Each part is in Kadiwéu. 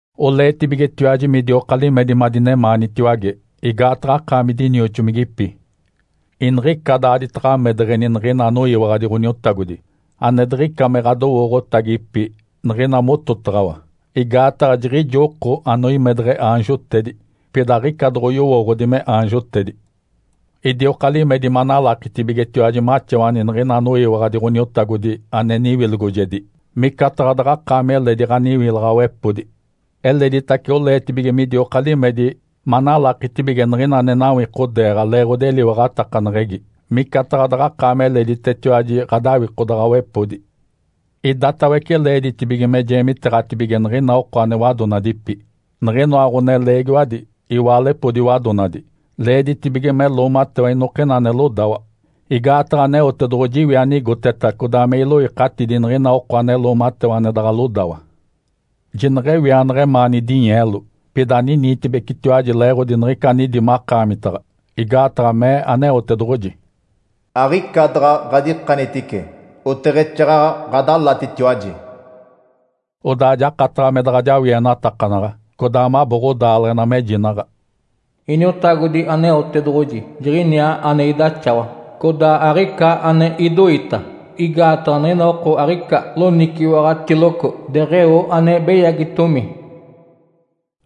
Oleetibigetiwaji midioka limedi madinemaanitiwage, igaataɡ̶a akaami dinioxomigipi. Iniɡ̶ica daaditaɡ̶a amedeɡ̶eni niɡ̶ina anoyiwaɡ̶adi Ǥoniotagodi ane diɡ̶ica me ɡ̶adowooɡ̶otagipi niɡ̶ina mototaɡ̶awa, igaataɡ̶a jiɡ̶ijo oko anoimedeɡ̶e aanjotedi, pida aɡ̶ica doɡ̶oyowooɡ̶odi me aanjotedi. Idioka limedi manalakitibigetiwaji maxawani niɡ̶ina anoyiwaɡ̶adi Ǥoniotagodi ane niwilogojedi, micataɡ̶a daɡ̶akaami eledi ɡ̶aniwilaɡ̶awepodi. Eleditace oleetibige midioka limedi manalakitibige niɡ̶ina ane nawikodeeɡ̶a leeɡ̶odi eliwaɡ̶atakaneɡ̶egi micataɡ̶a daɡ̶akaami eleditetiwaji ɡ̶adawikodaɡ̶awepodi. Idatawece leeditibige me jeemiteeɡ̶atibige niɡ̶ina oko ane wadonadipi. Niɡ̶inoa ɡ̶oneleegiwadi, iwaalepodi wadonadi, leeditibige me loomatewa inokina ane lodawa. Igaataɡ̶a Aneotedoɡ̶oji iwi anigoteta codaa me iloikatidi niɡ̶ina oko ane loomatewa ane daɡ̶a lodawa. Jineɡ̶ewianaɡ̶a emaani dinyeelo, pida aniniitibecitiwaji leeɡ̶odi niɡ̶ica anidi makaamitaɡ̶a, igaataɡ̶a mee Aneotedoɡ̶oji, “Aɡ̶ica daɡ̶a ɡ̶adikanitice, oteɡ̶exaaɡ̶aɡ̶a ɡ̶adalatitiwaji.” Odaa jakataɡ̶a me daɡ̶a jawienatakanaɡ̶a, codaa mabo ɡ̶odaaleɡ̶ena, mejinaɡ̶a, “Iniotagodi Aneotedoɡ̶oji Jiɡ̶iniaa ane idaxawa, codaa aɡ̶ica ane idoita, igaataɡ̶a niɡ̶ina oko aɡ̶ica loniciwaɡ̶atiloco deɡ̶eo ane beyagitomi.”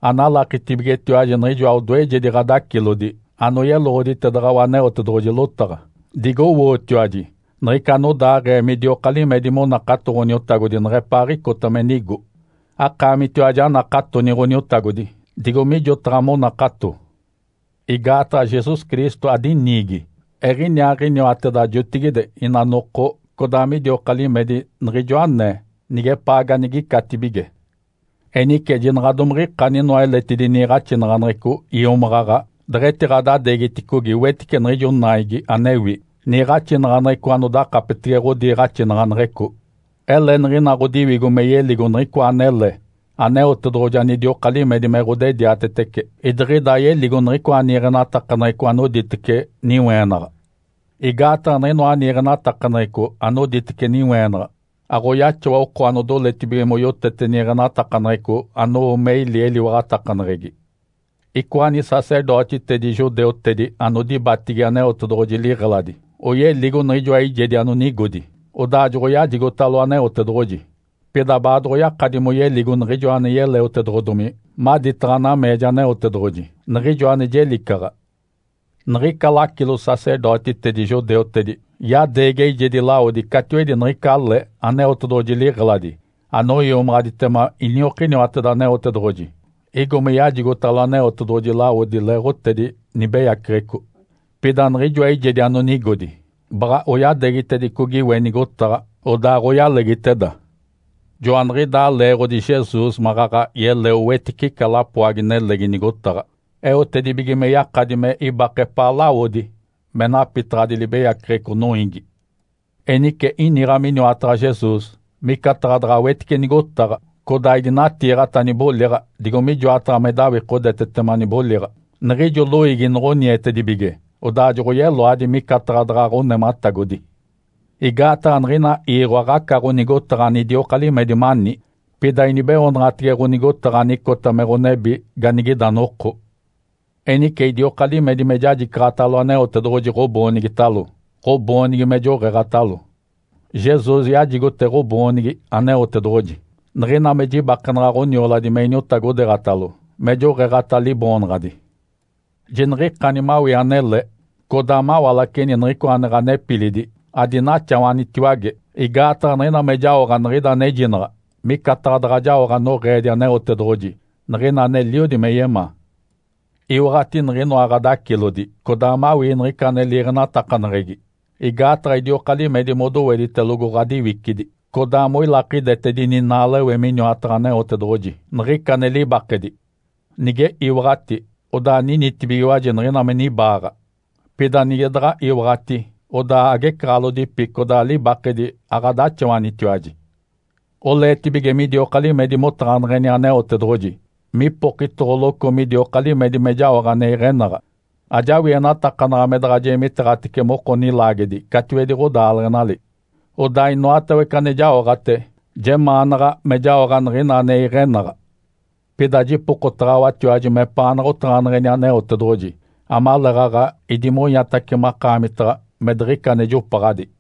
Analakitibigetiwaji niɡ̶ijoa odoejedi ɡ̶adacilodi anoyeloɡ̶oditedaɡ̶awa Aneotedoɡ̶oji lotaɡ̶a. Digowootiwaji niɡ̶ica anodaaɡ̶ee midioka limedi monakato Ǥoniotagodi neɡ̶epaaɡ̶icota me nigo. Akaamitiwaji anakatoni Ǥoniotagodi, digo mijotaɡ̶a monakato. Igaataɡ̶a Jesus Cristo adiniigi. Eɡ̶iniaaɡ̶iniwateda jotigide, ina noko, codaa midioka limedi niɡ̶ijo anee, nigepaa ganigicatibige. Enice jinaɡ̶a domiɡ̶ikani inoa eletidi niiɡ̶axinaɡ̶aneɡ̶eco iomaɡ̶aɡ̶a deɡ̶etiɡ̶adadeegiticogi wetice niɡ̶ijo naigi anewi, niiɡ̶axinaɡ̶aneɡ̶eco anodakapetege ɡ̶odiiɡ̶axinaɡ̶aneɡ̶eco. Ele niɡ̶ina ɡ̶odiwigo me yeligo niɡ̶icoa anele Aneotedoɡ̶oji anidioka limedi me ɡ̶odediatetece, idiɡ̶ida ayeligo niɡ̶icoa niiɡ̶enatakaneɡ̶eco anoditece niweenaɡ̶a. Igaataɡ̶a niɡ̶inoa niiɡ̶enatakaneɡ̶eco anoditece niweenaɡ̶a aɡ̶oyaxawa oko anodoletibige moyotete niiɡ̶enatakaneɡ̶eco anowo me ili eliwaɡ̶atakaneɡ̶egi. Icoa nisacerdotitedi judeutedi anodibatigi Aneotedoɡ̶oji liɡ̶eladi oyeligo niɡ̶ijoa eijedi anonigodi, odaa joɡ̶oyajigotalo Aneotedoɡ̶oji. Pida baadoɡ̶oyakadi moyeligo Niɡ̶ijoa ane yeleotedoɡ̶odomi maditaɡ̶a nameeja Aneotedoɡ̶oji, niɡ̶ijo ane jelicaɡ̶a. Niɡ̶ica lacilo-sacerdotitedi judeutedi yadeegi eijedi lawodi catiwedi niɡ̶ica le Aneotedoɡ̶oji liɡ̶eladi anoiomaɡ̶aditema iniokiniwateda Aneotedoɡ̶oji, igo me yajigotalo Aneotedoɡ̶oji lawodi leeɡ̶otedi nibeyaceɡ̶eco. Pida niɡ̶ijoa eijedi anonigodi baɡ̶a oyadeegitedicogi we nigotaɡ̶a, odaaɡ̶oyalegiteda. Joaniɡ̶idaa leeɡ̶odi Jesus maɡ̶aɡ̶a yeleo wetice ica lapoagi-nelegi nigotaɡ̶a, eotedibige me yakadi me ibake epaa lawodi me napitaɡ̶adi libeyaceɡ̶eco noiigi. Enice iniɡ̶a miniwataɡ̶a Jesus, micataɡ̶a daɡ̶a wetice nigotaɡ̶a, codaa idinatiiɡ̶ata niboliɡ̶a digo mijoataɡ̶a me dawikodetetema niboliɡ̶a, niɡ̶ijo loiigi noɡ̶onietedibige odaa joɡ̶oyeloadi micataɡ̶a daɡ̶a ɡ̶onematagodi. Igaataɡ̶a niɡ̶ina iiɡ̶o aɡ̶aca ɡ̶onigotaɡ̶a anidioka limedi mani, pida inibeoonaɡ̶atege ɡ̶onigotaɡ̶a anicota me ɡ̶onebi ganigida noko. Enice idioka limedi me jajicaɡ̶atalo Aneotedoɡ̶oji ɡ̶oboonigitalo, ɡ̶oboonigi me joɡ̶eeɡ̶atalo. Jesus yajigote ɡ̶oboonigi Aneotedoɡ̶oji. Niɡ̶ina me jibakenaɡ̶a ɡ̶onioladi me iniotagodeeɡ̶atalo, me joɡ̶eeɡ̶ata Liboonaɡ̶adi. Jiniɡ̶ikani mawii anele codaa mawalaceni niɡ̶icoa ane ɡ̶anepilidi adinaxawanitiwage, igaataɡ̶a niɡ̶ina me jaoɡ̶a niɡ̶ida anejinaɡ̶a, micataɡ̶a daɡ̶a jaoɡ̶a noɡ̶eedi Aneotedoɡ̶oji niɡ̶ina aneliodi me yemaa. Iwaɡ̶ati niɡ̶inoa ɡ̶adacilodi codaa mawii niɡ̶ica ane liiɡ̶enatakaneɡ̶egi. Igaataɡ̶a idioka limedi modoweditelogo ɡ̶adiwicidi, codaa moilakidetedini naalewe miniwataɡ̶a Aneotedoɡ̶oji, niɡ̶ica ane libakedi. Nige iwaɡ̶ati, odaa ninitibigiwaji niɡ̶ina me nibaaɡ̶a. Pida nige daɡ̶a iwaɡ̶ati odaa agecaɡ̶alodipi codaa libakedi aɡ̶adaxawanitiwaji. Oleetibige midioka limedi motaɡ̶aneɡ̶eni Aneotedoɡ̶oji mipokitoɡ̶oloco midioka limedi me jaoɡ̶a ane iɡ̶enaɡ̶a. Ajawienatakanaɡ̶a me daɡ̶a jeemiteeɡ̶atece moko nilaagedi catiwedi ɡ̶odaaleɡ̶enali. Odaa inoatawece ane jaoɡ̶ate jemaanaɡ̶a me jaoɡ̶a niɡ̶ina ane iɡ̶enaɡ̶a. Pida jipokotaɡ̶awatiwaji mepaanaɡ̶a otaɡ̶aneɡ̶eni Aneotedoɡ̶oji amaleeɡ̶aɡ̶a idimonyatace makaamitaɡ̶a me diɡ̶ica ane jopaɡ̶adi.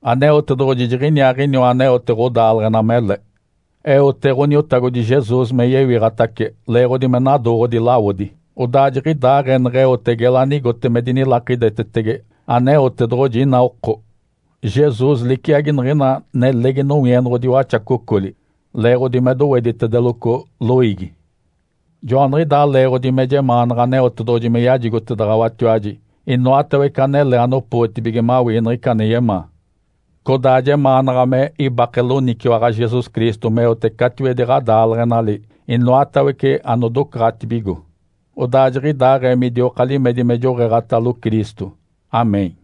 Aneotedoɡ̶oji Jiɡ̶iniaaɡ̶iniwa aneote ɡ̶odaaleɡ̶ena mele. Eote Ǥoniotagodi Jesus me yewiɡ̶atace leeɡ̶odi me nadooɡ̶odi lawodi, odaa jiɡ̶idaaɡ̶ee neɡ̶eote gela anigote me dinilakidetetege Aneotedoɡ̶oji inaa oko. Jesus liciagi niɡ̶ina nelegi nowienoɡ̶odi waxacocoli (leeɡ̶odi me doweditedeloco loiigi). Joaniɡ̶idaa leeɡ̶odi me jemaanaɡ̶a Aneotedoɡ̶oji me yajigotedaɡ̶awatiwaji inoatawece anele anopootibige mawii niɡ̶ica ane yemaa. Codaa jemaanaɡ̶a me ibake loniciwaɡ̶a Jesus Cristo meote catiwedi ɡ̶adaaleɡ̶enali inoatawece anodocaɡ̶atibigo. Odaa jiɡ̶idaaɡ̶ee midioka limedi me joɡ̶eeɡ̶atalo Cristo. Amém.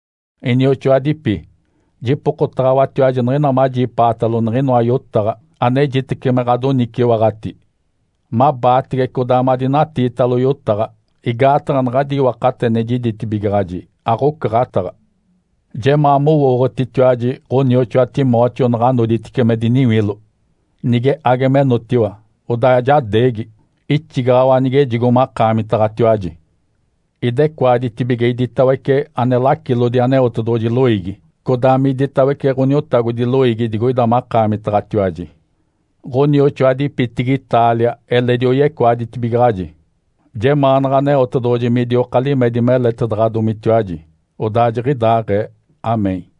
Inioxoadipi, jipokotaɡ̶awatiwaji niɡ̶ina majipaatalo niɡ̶inoa yotaɡ̶a, anejitece me ɡ̶adoniciwaɡ̶ati. Mabaatege codaa madinatiitalo yotaɡ̶a, igaataɡ̶a naɡ̶adi iwakate ane jiditibigaɡ̶aji aɡ̶ocaɡ̶ataɡ̶a. Jemaa mowooɡ̶otitiwaji ɡ̶onioxoa Timóteo naɡ̶a noditice me diniwilo. Nige age menotiwa, odaa jadeegi, ixigaɡ̶awa nigejigo makaamitaɡ̶atiwaji. Idecoaditibige iditawece ane lacilodi Aneotedoɡ̶oji loiigi, codaa miditawece Ǥoniotagodi loiigi digoida makaamitaɡ̶atiwaji. Ǥonioxoadipitigi Itália eledi oyecoaditibigaɡ̶aji. Jemaanaɡ̶a Aneotedoɡ̶oji midioka limedi meletedaɡ̶adomitiwaji. Odaa jiɡ̶idaaɡ̶ee. (Amém.)